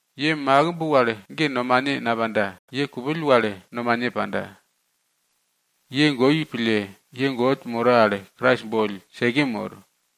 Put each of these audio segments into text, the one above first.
Ye makimb wal ge nomane napanda. Ye kupill wal nomane panda. Ye goi pille, ye God moro al Krais boll seke mor.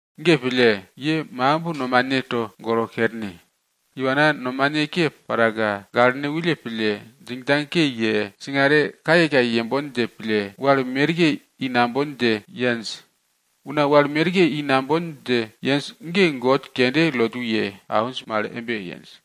Ge pille, ye makimb nomane togolo kerne. Iwana nomane ke paraka, gaklene wulle pille, djingdjang ke ye, singare kayekaye yembon dje pille, wal merke i nambon dje yenj. Una wal merke i nambon dje yenj ge god kende lotu ye awinj mal embe yenj.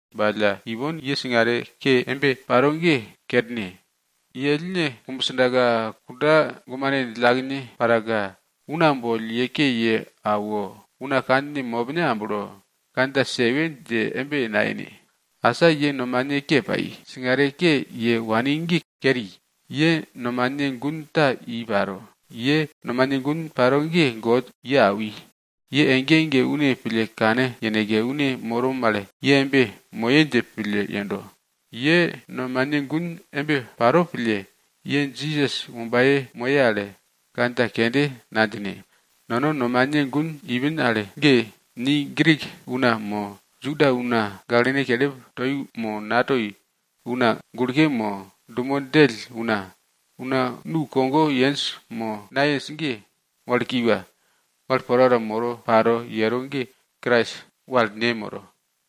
Ba alla ipon ye singare ke embe paro ge kerne. Ye ellne kumbsdaka, kunda gumane djillakene paraka, una boll ye ke ye awo, una kandjine mopne amblo, kandja sewe dje embe nayene. Asa ye nomane ke pai, singare ke ye wani ge keri, ye nomane gun ta i paro. Ye nomane gun paro ge God ye awi. Ye ege ege une pille kane yeneke, une moro mal ye embe moye dje pille yendo. Ye nomane gun embe paro pille, ye Jisas wombaye moye al kandja kende nadjine. Nono nomane gun ipin al ge ni Grik una mo, Juda una, gaklen kelip toi mo natoi, una gulke mo dumo djell una, una nukogo yenj mo, nayenj ge, wal kiwa, wal porapora moro paro yero ge, Krais wal ne moro.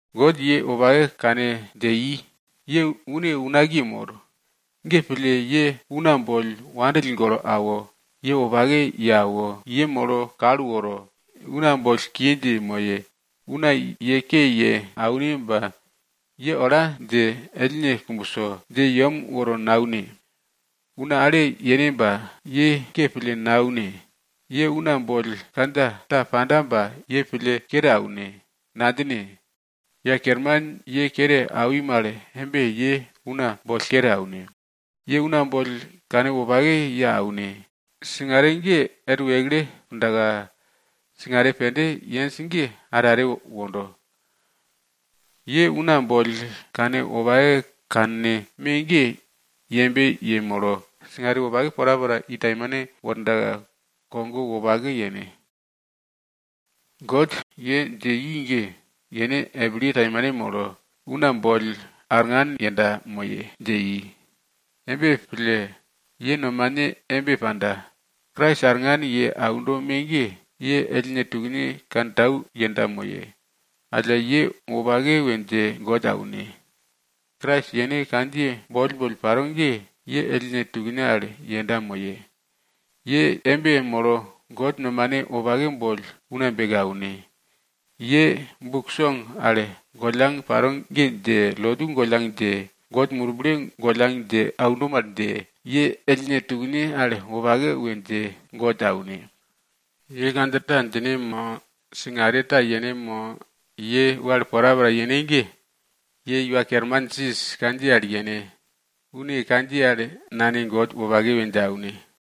God ye wopake kane dje i, ye une unakiye mor. Ge pille ye una boll wandill golo awo, ye wopake ye awo, yemolo kal woro, una boll kiye dje moye. Una ye ke ye aune ba ye ola dje ellne kumbso dje yem woro naune. Una ale yene ba ye ke pille naune. Ye una boll kandja ta panda ba ye pille kere aune, nadjine. Iwa Kerman ye kere awi mal embe ye una boll kere aune. Ye una boll kanwopake ye aune. Singare ge er wekle pundaka singare pende yenj ge are are wondo. Ye una boll kanwopake kanne me ge yembe yemolo singare wopake porapora i taimane wordaka kogo wopake yene. God ye dje i ge, yene epilye taimane molo, una boll arngan yenda moye dje, dje i. Embe pille, ye nomane embe panda, Krais arngan ye aundo me ge, ye ellne tukne kantau yenda moye. Alla, ye wopake we dje God aune. Krais yene kandjiye boll boll paro ge, ye ellne tukne al yenda moye. Ye embe molo God nomane wopake boll una beke aune. Ye buk song al gollang paro ge dje, lotu gollang dje, God Murble gollang dje aundo mal dje, ye ellne tukne al wopake we dje God aune. Ye kandja ta djine mo, singare ta yene mo, ye wal porapora yene ge, ye Iwa Kerman Jisas kandjiye al yene. Une kandjiye al Nane God wopake we dje aune.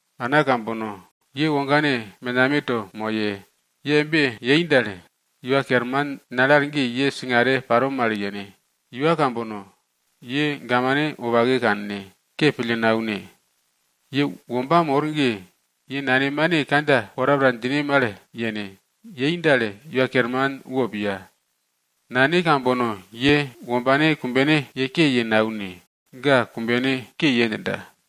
Ana kambono, ye wogane menameto moye. Ye embe yei dal, Iwa Kerman nale al ge ye singare paro mal yene. Iwa kambono, ye gamane wopake kanne, ke pille naune. Ye womba mor ge, ye nanemane kandja porapora djine mal yene. Yei dal, Iwa Kerman wo piya. Nane kambono, ye wombane kumbene ye ke ye naune. Ga kumbene ke ye djinda.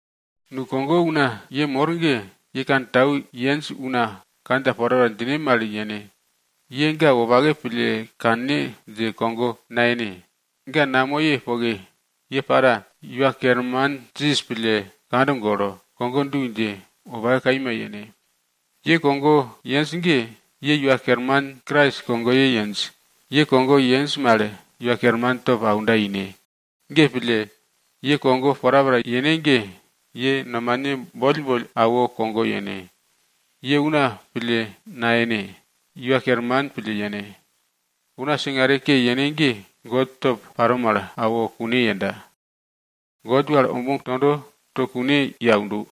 Boi kogo una ye mor ge, ye kantau yenj una kandja porapora djine mal yene. Ye ga wopake pille kanne dje kogo nayene, ga namoye poke ye para, Iwa Kerman Jisas pille kand golo, kogo du dje wopake kaima yene. Ye kogo yenj ge, ye Iwa Kerman Krais kogoye yenj. Ye kogo yenj mal Iwa kerman top aunda ine. Ge pille, ye kogo porapora yene ge, ye nomane boll boll awo kogo yene. Ye una pille nayene, ye Iwa Kerman pille yene. Una singare ke yene ge, God top paro mal, awo kune yenda. God wal omuk tondo, to kune ye aundo.